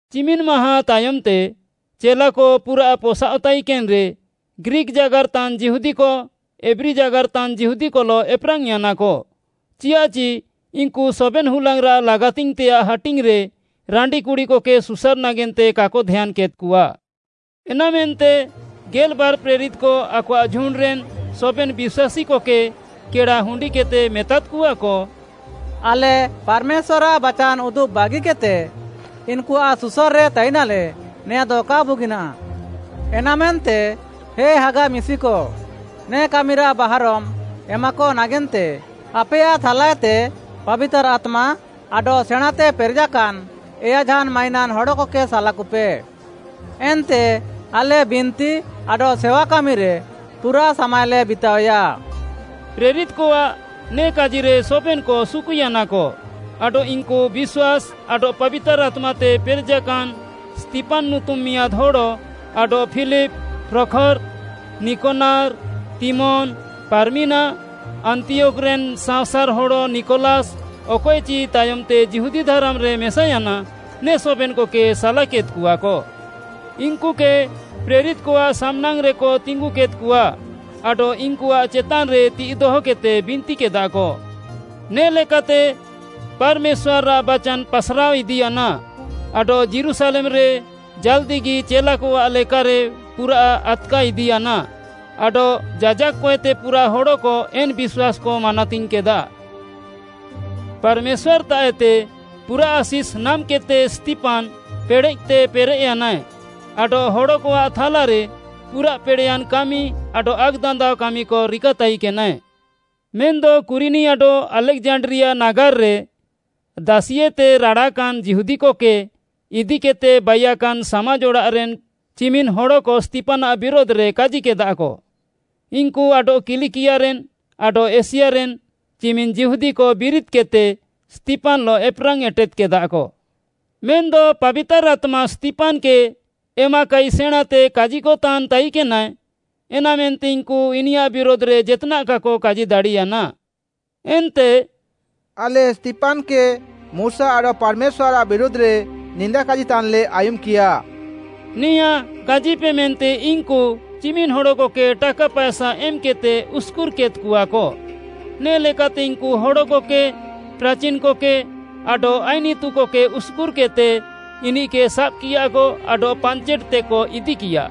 ଚିମିନ୍‌ ମାହାଁ ତାୟମ୍‌ତେ ଚେଲାକ ପୁରାଃ ପସାଅଃତାଇକେନ୍‌ରେ ଗ୍ରୀକ୍‌ ଜାଗାର୍‌ତାନ୍‌ ଯିହୁଦୀକ, ଏବ୍ରୀ ଜାଗାର୍‌ତାନ୍‌ ଯୀହୁଦିକଲଃ ଏପ୍‌ରାଙ୍ଗ୍‌ୟାନାକ, ଚିୟାଃଚି ଇନ୍‌କୁ ସବେନ୍‌ ହୁଲାଙ୍ଗ୍‌ରାଃ ଲାଗାତିଙ୍ଗ୍‌ତେୟାଃ ହାଟିଙ୍ଗ୍‌ରେ ରାଣ୍ଡିକୁଡ଼ିକକେ ସୁସାର୍‌ ନାଗେନ୍ତେ କାକ ଧ୍ୟାନ୍‌କେଦ୍‌କଆ। ଏନାମେନ୍ତେ ଗେଲ୍‌ବାର୍‌ ପ୍ରେରିତ୍‌କ ଆକଆଃ ଝୁଣ୍ଡ୍‌ରେନ୍‌ ସବେନ୍‌ ବିଶ୍ୱାସୀକକେ କେଡ଼ା ହୁଣ୍ଡିକେଦ୍‌ତେ ମେତାଦ୍‌କଆକ, “ଆଲେ ପାର୍‌ମେଶ୍ୱାର୍‌ଆଃ ବାଚାନ୍‌ ଉଦୁବ୍‌ ବାଗିକେଦ୍‌ତେ, ଇନ୍‌କୁଆଃ ସୁସାର୍‌ରେ ତାଇନାଲେ, ନେଆଁଦ କା ବୁଗିନାଃ। ଏନାମେନ୍ତେ ହେ ହାଗା ମିଶିକ, ନେ କାମିରାଃ ବାହାରମ୍‌ ଏମାକ ନାଗେନ୍ତେ ଆପେୟାଃ ଥାଲାଏତେ ପାବିତାର୍‌ ଆତ୍ମା ଆଡଃ ସେଣାଁଁତେ ପେରେଜାକାନ୍‌ ଏୟାଝାନ୍‌ ମାଇନାନ୍‌ ହଡ଼କକେ ସାଲାକୁପେ। ଏନ୍ତେ ଆଲେ ବିନ୍ତି ଆଡଃ ସେୱାକାମିରେ ପୁରା ସାମାଏଲେ ବିତାଅୟା।” ପ୍ରେରିତ୍‌କଆଃ ନେ କାଜିରେ ସବେନ୍‌କ ସୁକୁୟାନାକ ଆଡଃ ଇନ୍‌କୁ ବିଶ୍ୱାସ୍‌ ଆଡଃ ପାବିତାର୍‌ ଆତ୍ମାତେ ପେରେଜାକାନ୍‌ ସ୍ତିଫାନ୍‌ ନୁତୁମ୍‌ ମିଆଁଦ୍‌ ହଡ଼, ଆଡଃ ଫିଲିପ୍‌, ପ୍ରଖର୍‌, ନିକନାର୍‌, ତିମୋନ୍‌, ପାର୍ମିନା, ଆନ୍ତିୟୋଖ୍‌ରେନ୍ ସାଅଁସାର୍‌ ହଡ଼ ନିକଲାସ୍‌ ଅକଏଚି ତାୟମ୍‌ତେ ଯିହୁଦୀ ଧାରାମ୍‌ରେ ମେସାୟାନା, ନେ ସବେନ୍‌କକେ ସାଲାକେଦ୍‍କଆକ। ଇନ୍‌କୁକେ ପ୍ରେରିତ୍‌କଆଃ ସାମ୍‌ନାଙ୍ଗ୍‌ରେକ ତିଙ୍ଗୁକେଦ୍‍କଆ ଆଡଃ ଇନ୍‌କୁଆଃ ଚେତାନ୍‌ରେ ତିଃଇ ଦହକେଦ୍‌ତେ ବିନ୍ତିକେଦାକ। ନେ ଲେକାତେ ପାର୍‌ମେଶ୍ୱାର୍‌ଆଃ ବାଚାନ୍‌ ପାସ୍‍ରାଅଇଦିୟାନା ଆଡଃ ଯୀରୁଶାଲେମ୍‌ରେ ଜାଲ୍‌ଦିଗି ଚେଲାକଆଃ ଲେକାରେ ପୁରାଃ ଆଦ୍‍କାଇଦିୟାନା ଆଡଃ ଯାଜାକ୍‌ କଏତେ ପୁରାଃ ହଡ଼କ, ଏନ୍‌ ବିଶ୍ୱାସ୍‌କ ମାନାତିଙ୍ଗ୍‌କେଦା। ପାର୍‌ମେଶ୍ୱାର୍‌ତାଃଏତେ ପୁରାଃ ଆଶିଷ୍‌ ନାମ୍‌କେଦ୍‌ତେ ସ୍ତିଫାନ୍‌ ପେଡ଼େଃତେ ପେରେଃୟାନାଏ ଆଡଃ ହଡ଼କଆଃ ଥାଲାରେ ପୁରାଃ ପେଡ଼େୟାନ୍‌ କାମି ଆଡଃ ଆକ୍‌ଦାନ୍ଦାଅ କାମିକ ରିକାତାଇକେନାଏ। ମେନ୍‌ଦ କୁରିନି ଆଡଃ ଆଲେକ୍‌ଜାଣ୍ଡ୍ରିଆ ନାଗାର୍‌ରେ ଦାସିୟେତେ ରାଡ଼ାକାନ୍‌ ଯୀହୁଦିକକେ ଇଦିକେଦ୍‌ତେ ବାଇୟାକାନ୍‌ ସାମାଜ୍‌ ଅଡ଼ାଃରେନ୍‌ ଚିମିନ୍‌ ହଡ଼କ ସ୍ତିଫାନ୍‌ଆଃ ବିରୁଧ୍‌ରେ କାଜିକେଦାକ। ଇନ୍‌କୁ ଆଡଃ କିଲିକିଆରେନ୍‌, ଆଡଃ ଏସିଆରେନ୍‍ ଚିମିନ୍‌ ଯିହୁଦୀକ ବିରିଦ୍‌କେଦ୍‌ତେ ସ୍ତିଫାନ୍‌ଲଃ ଏପେରାଙ୍ଗ୍‌ ଏଟେଦ୍‌କେଦାକ। ମେନ୍‌ଦ ପାବିତାର୍‌ ଆତ୍ମା ସ୍ତିଫାନ୍‌କେ ଏମାକାଇ ସେଣାଁଁତେ କାଜିକତାନ୍‌ ତାଇକେନାଏ, ଏନାମେନ୍ତେ ଇନ୍‌କୁ ଇନିୟାଃ ବିରୁଧ୍‌ରେ ଜେତ୍‌ନାଃ କାକ କାଜି ଦାଡ଼ିୟାନା। ଏନ୍ତେ “ଆଲେ ସ୍ତିଫାନ୍‌କେ ମୁଶା ଆଡଃ ପାର୍‌ମେଶ୍ୱାର୍‌ଆଃ ବିରୁଧ୍‌ରେ ନିନ୍ଦା କାଜିତାନ୍‍ଲେ ଆୟୁମ୍‍କିୟା” ନେଆଁଁ କାଜିପେ ମେନ୍ତେ ଇନ୍‌କୁ ଚିମିନ୍‌ ହଡ଼କକେ ଟାକା ପାଏସା ଏମ୍‌କେଦ୍‌ତେ ଉସ୍‍କୁର୍‍କେଦ୍‍କଆକ। ନେ'ଲେକାତେ ଇନ୍‌କୁ ହଡ଼କକେ, ପ୍ରାଚିନ୍‌କକେ, ଆଡଃ ଆଇନ୍‌ ଇତୁକକେ ଉସ୍‍କୁର୍‍କେଦ୍‌ତେ ଇନିଃକେ ସାବ୍‌କିୟାକ ଆଡଃ ପାଞ୍ଚେଟ୍‌ତେକ ଇଦିକିୟା।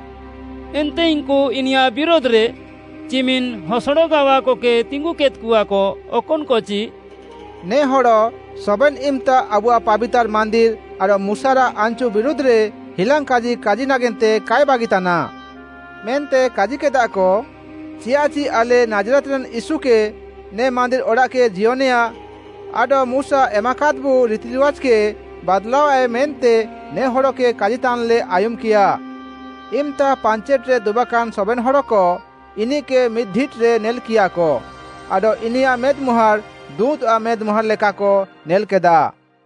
ଏନ୍ତେ ଇନ୍‌କୁ ଇନିୟାଃ ବିରୁଧ୍‌ରେ ଚିମିନ୍‌ ହସଡ଼ ଗାୱାକକେ ତିଙ୍ଗୁକେଦ୍‍କଆକ, ଅକନ୍‌କଚି, “ନେ ହଡ଼ ସବେନ୍‌ ଇମ୍‌ତା ଆବୁଆଃ ପାବିତାର୍‌ ମାନ୍ଦିର୍‌ ଆଡଃ ମୁଶାରାଃ ଆନ୍‌ଚୁ ବିରୁଧ୍‌ରେ ହିଲାଙ୍ଗ୍‌କାଜି କାଜି ନାଗେନ୍ତେ କାଏ ବାଗିତାନା” ମେନ୍ତେ କାଜିକେଦାକ। ଚିୟାଃଚି ଆଲେ, ନାଜ୍‌ରେତ୍‌ରେନ୍‌ ୟୀଶୁକେ ନେ ମାନ୍ଦିର୍‌ ଅଡ଼ାଃକେ ଜିୟନେଆ ଆଡଃ ମୁଶା ଏମାକାଦ୍‌ବୁ ରିତିରିୱାଜ୍‌କେ ବାଦ୍‍ଲାଅୟାଏ ମେନ୍ତେ ନେ ହଡ଼କେ କାଜିତାନ୍‍ଲେ ଆୟୁମ୍‌କିୟା। ଇମ୍‌ତା ପାଞ୍ଚେଟ୍‌ରେ ଦୁବାକାନ୍‌ ସବେନ୍‌ ହଡ଼କ ଇନିଃକେ ମିଦ୍‌ଢିଟ୍‌ରେ ନେଲ୍‍କିୟାକ ଆଡଃ ଇନିୟାଃ ମେଦ୍‌ମୁହାଁଡ଼୍‌ ଦୁଁତ୍‌ଆଃ ମେଦ୍‍ମୁହାଁଡ଼୍‌ ଲେକାକ ନେଲ୍‌କେଦା।